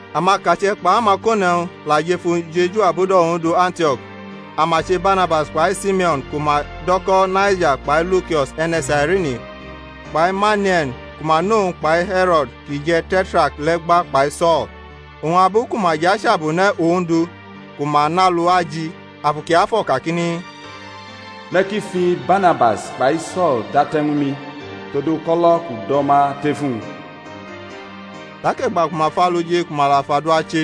Amakache̩ kpʼamakone̩wñ la jʼef ujeju abudo̩ Ondu Antio̩k; ama che Barnabas kpai Simeo̩n ku ma do̩ ko̩ Naija kpai Lukio̩s e̩ne̩ Sairini kpai Mane̩e̩n ku ma nʼowñ kpai He̩ro̩d kʼi je̩ Te̩trak le̩ gba kpai So̩l. Oñ abu ku ma jʼachabune̩ Ondu, ku ma nʼalu aji, Afu Kiafo̩ kakini, Me̩ ki fi Barnabas kpai So̩l date̩ ñw mi tod uko̩lo̩ kʼu do̩ ma tʼef uwñ. Tak e̩gba ku ma fʼalu ji ku ma la fʼadua che,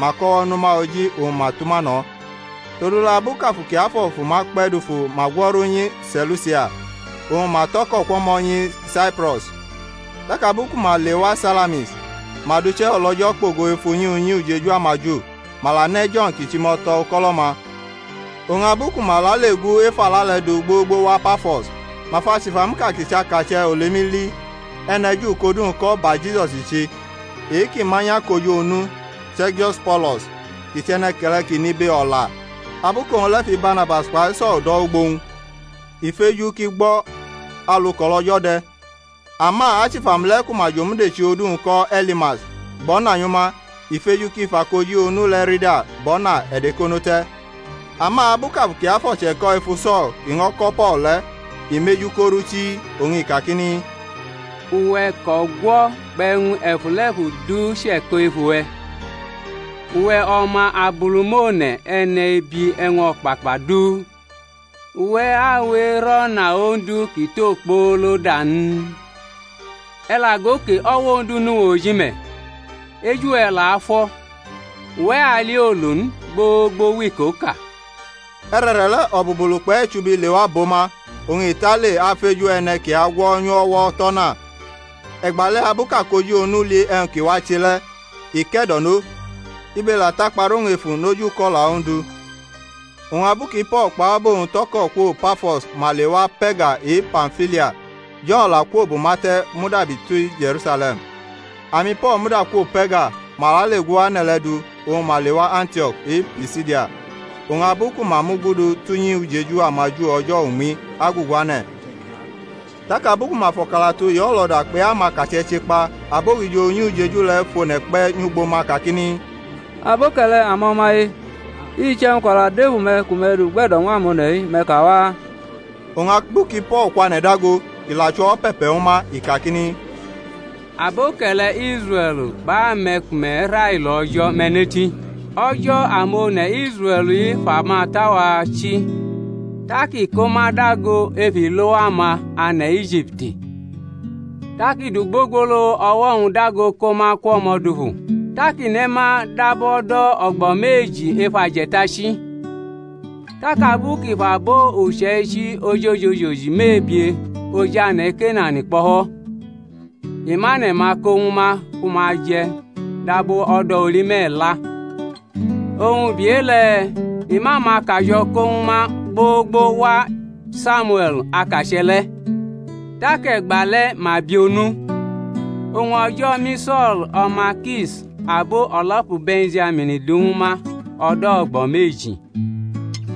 ma kʼo̩wo̩ nʼuma oji oñ ma tʼuma no̩. Todule̩ abu kʼAfu Kiafo̩ fʼuma kpe̩ dufu ma gwo̩ru nyi Se̩lusia; oñ ma tʼo̩ko̩ kwʼo̩mo̩ nyi Saipro̩s. Tak abu ku ma lewa Salamis, ma dʼuche o̩lO̩jo̩ kpo̩go ef unyi unyi ujeju amaju. Ma la ne̩ Jo̩n kʼi chʼimo̩to̩ uko̩lo̩-ma. Oñ abu ku ma lale gu ef ala le̩ du gbogbo wa Pafo̩s, ma fʼachifamuʼka kʼi chʼakache̩ olemi li, e̩ne̩ Ju kʼodu-wñ ko̩ Barjisus i che. E-kʼi manyʼakoji onu, Se̩rgius Po̩lo̩s, kʼi chʼe̩ne̩ke̩le̩ kʼi nʼibe, o̩la. Abu kʼowñ le̩ fi Barnabas kpai So̩l do̩ wʼugbo-wñ, i feju kʼi gbo̩ alu kʼo̩lO̩jo̩ de̩. Ama achifamu le̩ ku ma jomudechi odu-wñ ko̩ Elimas, gbo̩nanyʼuma, i feju kʼi fʼakoji onu le̩ rida bʼo̩na e̩dekono te̩. Ama abu kʼAfu Kiafo̩ che̩ko̩ efu So̩l kʼi ño̩ ko̩ Po̩l le̩, i mʼeju korʼu chii, oñ i kakini, Uwe̩ kʼo̩gwo̩ kpʼe̩wñ e̩fule̩fu du che̩ko̩ ef uwe̩, uwe̩ o̩ma Abulumone̩, e̩nebi e̩wñ o̩kpakpa du, uwe̩ awe erʼo̩na Ondu kʼi tʼokpoolo da n? E̩ la go ke, o̩wo̩ Ondu nʼuwe̩ oji me̩, eju we̩ la afo̩, uwe̩ ali olu n gbogbo wʼikoʼka. E̩re̩re̩le̩ o̩bulubulu kpʼe̩chubi lewa bʼo ma, oñ i tale afeju e̩ne̩ ki agwo̩nyʼu o̩wo̩ tʼo̩na. E̩gbale̩ abu kʼakoji onu li e̩wñ ki wache le̩, i ke̩do̩no, ibe la takpa rʼowñ efu noji uko̩la Ondu. Oñ abu ki Po̩l kpʼabo-wñ tʼo̩ko̩ kwo Pafo̩s ma lewa Pe̩rga e-Pamfilia; Jo̩n la kwo bʼuma te̩ mudabi ti Je̩rusale̩m. AmiPo̩l muda kwo Pe̩rga, ma lale gu ane̩ le̩ du oñ ma lewa Antiok e-Pisidia; oñ abu ku ma mugudu tʼunyi ujeju amaJu o̩jo̩ uñmi agugu ane̩. Tak abu ku ma fʼo̩kalatu e-olo̩da kpai e-amakache̩ che kpa abogijo unyi ujeju le̩ fʼone̩ kpe̩ nyʼugbo ma kakini, Aboke̩le̩, amo̩maye, iche̩wñ kʼo̩la dʼef ume̩ ku me̩ dʼugbe̩do̩ ñw amone̩-i, me̩ ka waa. Oñ abu ki Po̩l kwane̩ dago, kʼi la chʼo̩wo̩ pe̩pe̩ ñwu ma, i kakini: Aboke̩le̩ Israe̩l kpʼame̩ ku me̩ railo O̩jo̩, me̩ neti. O̩jo̩ amone̩ Tsrae̩l-i fʼamata-wa chi tak i ko ma dago ef ilowa-ma ane̩ Ijipti, tak i dʼugbogbolo o̩wo̩-wñ dago ko ma kwʼo̩mo̩ dufu. Tak i ne̩ ma dab o̩do̩ o̩gbo̩ meji ef aje̩tachi. Tak abu kʼi fʼabo uche̩ichi ojoji mebie oj ane̩ Kenan kpo̩fo̩, i mʼane̩-ma ko ñwu ma ku ma je̩ dab o̩do̩ oli me̩la. Oñ ubi e-le̩ i mʼamakajo̩ ko ñwu ma gbogbo wa Samiue̩l akache̩ le̩. Tak e̩gba le̩ ma bi onu: oñ O̩jo̩ mi So̩l, o̩ma Kish, abo o̩lo̩pu Be̩njamin du ñw ma o̩do̩ o̩gbo̩ meji.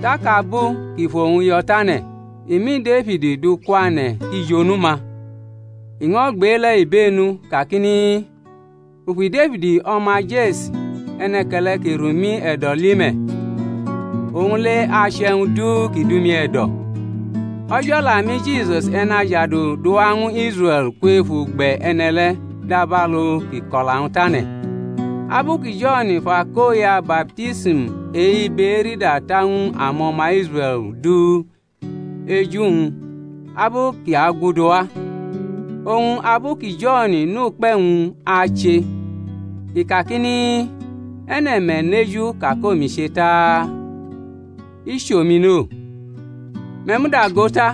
Tak abu kʼi fʼowñ yo̩ tane̩, i mi Defid du kwane̩ kʼi jʼonu-ma; i ño̩ gbʼe-le̩ ibenu kakini, U fi Defid o̩ma Je̩si, e̩ne̩ke̩le̩ ki rʼumi e̩do̩, li me̩, owñ le̩ ache e̩wñ du ki dʼumi e̩do̩. O̩jo̩ la mi Jisus E̩najadu, duwa ñw Israe̩l kwef ugbe̩ e̩ne̩ le̩ dabalu kʼi ko̩la-wñ tane̩; abu ki Jo̩n fʼakoya baptism e-ibe erida ta ñw amo̩ma Israe̩l du eju-wñ abu kʼi aguduwa. Oñ abu ki Jo̩n nʼukpe̩-wñ ache, i kakini, E̩ne̩ me̩ neju ka kʼomi che ta? I chʼomi no. Me̩ muda go ta,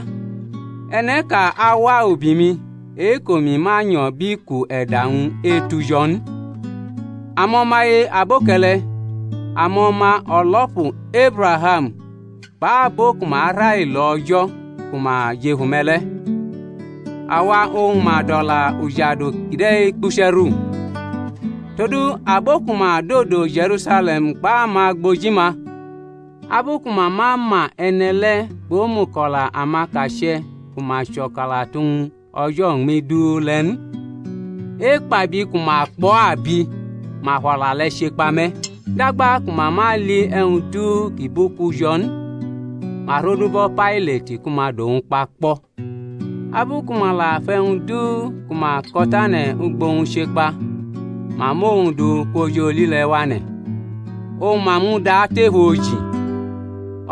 e̩ne̩ʼka awa ubi-mi, e-kʼomi ma nyo̩ bʼiku e̩da-wñ etu jo̩ n. Amo̩maye, aboke̩le̩, amo̩ma o̩lo̩pu Ebraham, kpʼabo ku ma railo O̩jo̩ ku ma jʼef ume̩ le̩, awa oñ ma dʼo̩la ujadu kide̩ kpuche̩ru. Todu abo ku ma dodo Je̩rusale̩m kpʼamagboji-ma, abu ku ma ma ma e̩ne̩ le̩ kpʼomuko̩la amakache̩ ku ma chʼo̩kalatu-wñ o̩jo̩ uñmi du le̩ n, ekpabi ku ma kpʼo̩ abi ma fʼo̩la le̩ che kpa me̩. Dagba ku ma ma li e̩wñ du ki bʼuku jo̩ n, ma rodubo̩ Pailat ku ma dʼowñ kpa kpo̩. Abu ku ma la fʼe̩wñ du ku ma ko̩tane̩ ugbo-wñ che kpa, ma mʼowñ du kwʼoj oli le̩ wane̩, oñ ma mʼu du atʼef oji.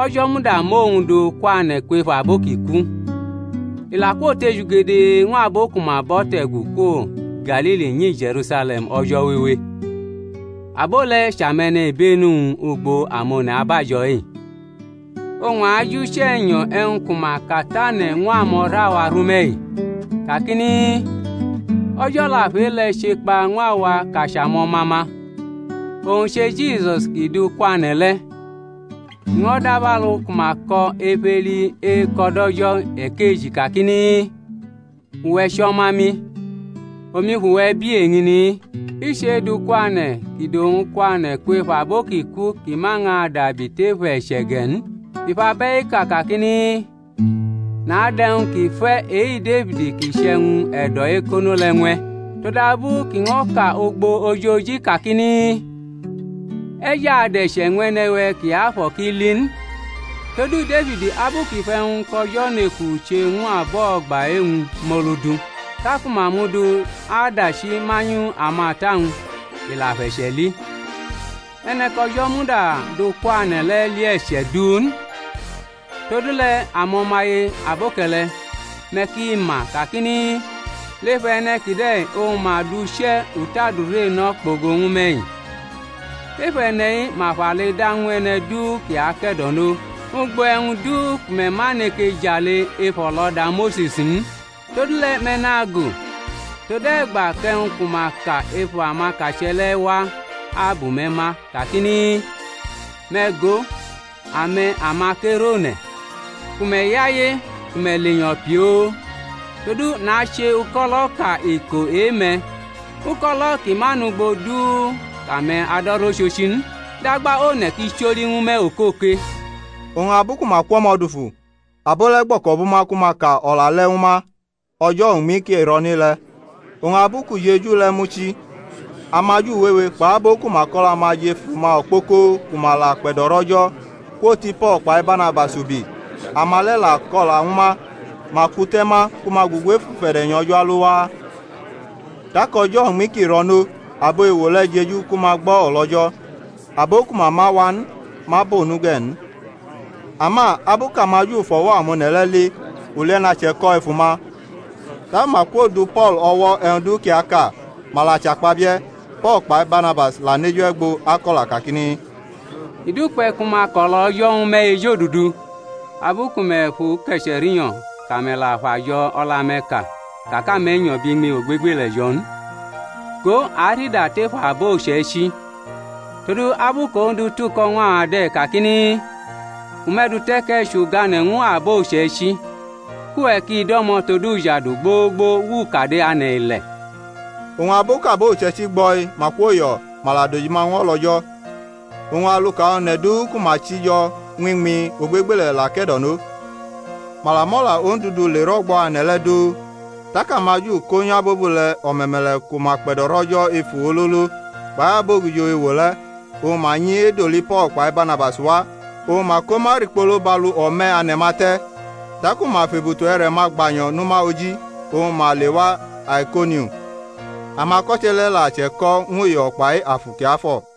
O̩jo̩ muda mʼowñ du kwane̩ kwef abo ki ku. I la kwotejugede ñw abo ku ma bʼo̩ te̩gu kwo Galili nyi Je̩rusale̩m o̩jo̩ wewe: abo le̩ chʼame̩nibenu-wñ ugbo amone̩ abajo̩-i. Oñ a ajuche̩nyo̩ e̩wñ ku ma katane̩ ñw amo̩ra-wa rʼume̩-i, kakini, O̩jo̩ la fʼe-le̩ che kpa ñw awa kʼa chʼamo̩ma-ma, owñ che Jisusi kʼi du kwane̩ le̩; i ño̩ dabalu ku ma ko̩ ef Eli Eko̩ DʼO̩jo̩ ekeji kakini, Uwe̩ chʼo̩ma-mi, omi fʼuwe̩ bi eñini-i. I chʼe-edʼu kwane̩ kʼi dʼowñ kwane̩ kwef abo ki ku kʼi ma ñʼadabi tef e̩che̩ ge̩ n, i fʼabe̩-i ka kakini, Nadʼe̩wñ ki fe̩ e-Defid, kʼi chʼe̩wñ e̩do̩ ekono le̩ ñw e̩. Todabu kʼi ño̩ ka ugbo ojoji kakini, E̩ jʼadʼe̩che̩ ñw E̩ne̩-we̩ kiafo̩ kʼi li n. Todu Defid, abu kʼi fʼe̩wñ kʼO̩jo̩ neku che ñw abo o̩gba e̩-wñ, mʼolu du, taku ma mʼu du adachi manyʼamata-wñ, i la fʼe̩che̩ li. E̩ne̩ kʼO̩jo̩ muda dʼu kwane̩ le̩ li e̩che̩ du n. Todule̩ amo̩maye, aboke̩le̩, me̩ ki ma kakini, Le̩f e̩ne̩ kide̩ oñ ma dʼuche̩ utʼadure no̩ kpogo ñw me̩-i; ef e̩ne̩-i ma fʼale da ñw e̩ne̩ du ki ake̩do̩no ugbo e̩wñ du ku me̩ ma neke jale ef o̩lo̩da Mose̩s n. Todule̩ me̩ nago̩, tode̩gba kʼe̩wñ ku ma ka ef amakache̩ le̩ wa abʼume̩ ma kakini, Me̩ go, ame̩ amakerʼone̩, ku me̩ yaye, ku me̩ lenyo̩ pioo̩; todu nache uko̩lo̩ʼka iko e-me̩, uko̩lo̩ ki ma nʼugbo du kʼame̩ ado̩rʼochochi n, dagba one̩ ki choli ñw me̩ okoke. Oñ abu ku ma kwʼo̩mo̩ dufu, abo le̩ gbo̩ko̩bʼuma ku ma ka o̩la le̩ ñw ma o̩jo̩ uñmi ki ro̩nʼe-le̩. Oñ abu kʼujeju le̩ muchi, amaju wewe kpʼabo ku ma kʼo̩la-ma jʼef uma okpoko ku ma la akpe̩do̩rʼO̩jo̩, kwoti Po̩l kpai Barnabas ubi; ama le̩ la ko̩la ñw ma, ma kute̩ ma ku ma gugu ef ufe̩de̩nyo̩ O̩jo̩ alo waa. Tak o̩jo̩ uñmi ki ro̩nʼo abo ewo le̩ jeju ku ma gbo̩ o̩lO̩jo̩, abo ku ma ma wa n ma bʼonu ge̩ n. Ama abu kʼamaJu fʼo̩wo̩ amone̩ le̩ li, ulie̩na che̩ko̩ ef uma, taku ma kwo du Po̩l o̩wo̩ e̩wñ du kʼi aka, ma la chakpabie̩. Po̩l kpai Barnabas la nʼeju e̩gbo ako̩la kakini, I dukpe̩ ku ma kʼo̩lO̩jo̩ ñwu me̩ ejodudu. Abu ku me̩ fʼu ke̩che̩ rinyo̩, kʼame̩ la fʼajo̩ o̩la-me̩ ka ka kʼame̩ nyo̩ bʼiñmi ogbegbele̩ jo̩ n, go, a arida tef abo uche̩ichi. Todu abu kʼOndu tuko̩ ñw a de̩ kakini, U mʼe̩ dute̩ kʼe̩ chʼugane̩ ñw abo uche̩ichi, kʼuwe̩ ki do̩mo̩ tod ujadu gbogbo wʼukade ane̩-ile̩. Oñ abu kʼabo uche̩ichi gbo̩-i ma kwoyo̩, ma la dojima ñw o̩lO̩jo̩; oñ aluka one̩ du ku ma chi jo̩ ñw iñmi ogbegbele̩ la ke̩do̩no. Ma la mʼo̩la Ondu du le rʼo̩gbo̩ ane̩ le̩ du. Tak amaJu ko̩nyʼabobule̩ o̩me̩me̩le̩ ku ma kpe̩do̩rʼO̩jo̩ efu ololo, kpai abogijo ewo le̩, oñ ma nyi edoli Po̩l kpai Barnabas wa, oñ ma ko ma rikpolo bʼalu o̩me̩ ane̩-ma te̩. Taku ma fʼebutu e̩re̩-ma gbanyo̩ nʼuma oji oñ ma lewa Aikonium. Amako̩che̩ le̩ la che̩ko̩ ñw uyo̩ kpai Afu Kiafo̩.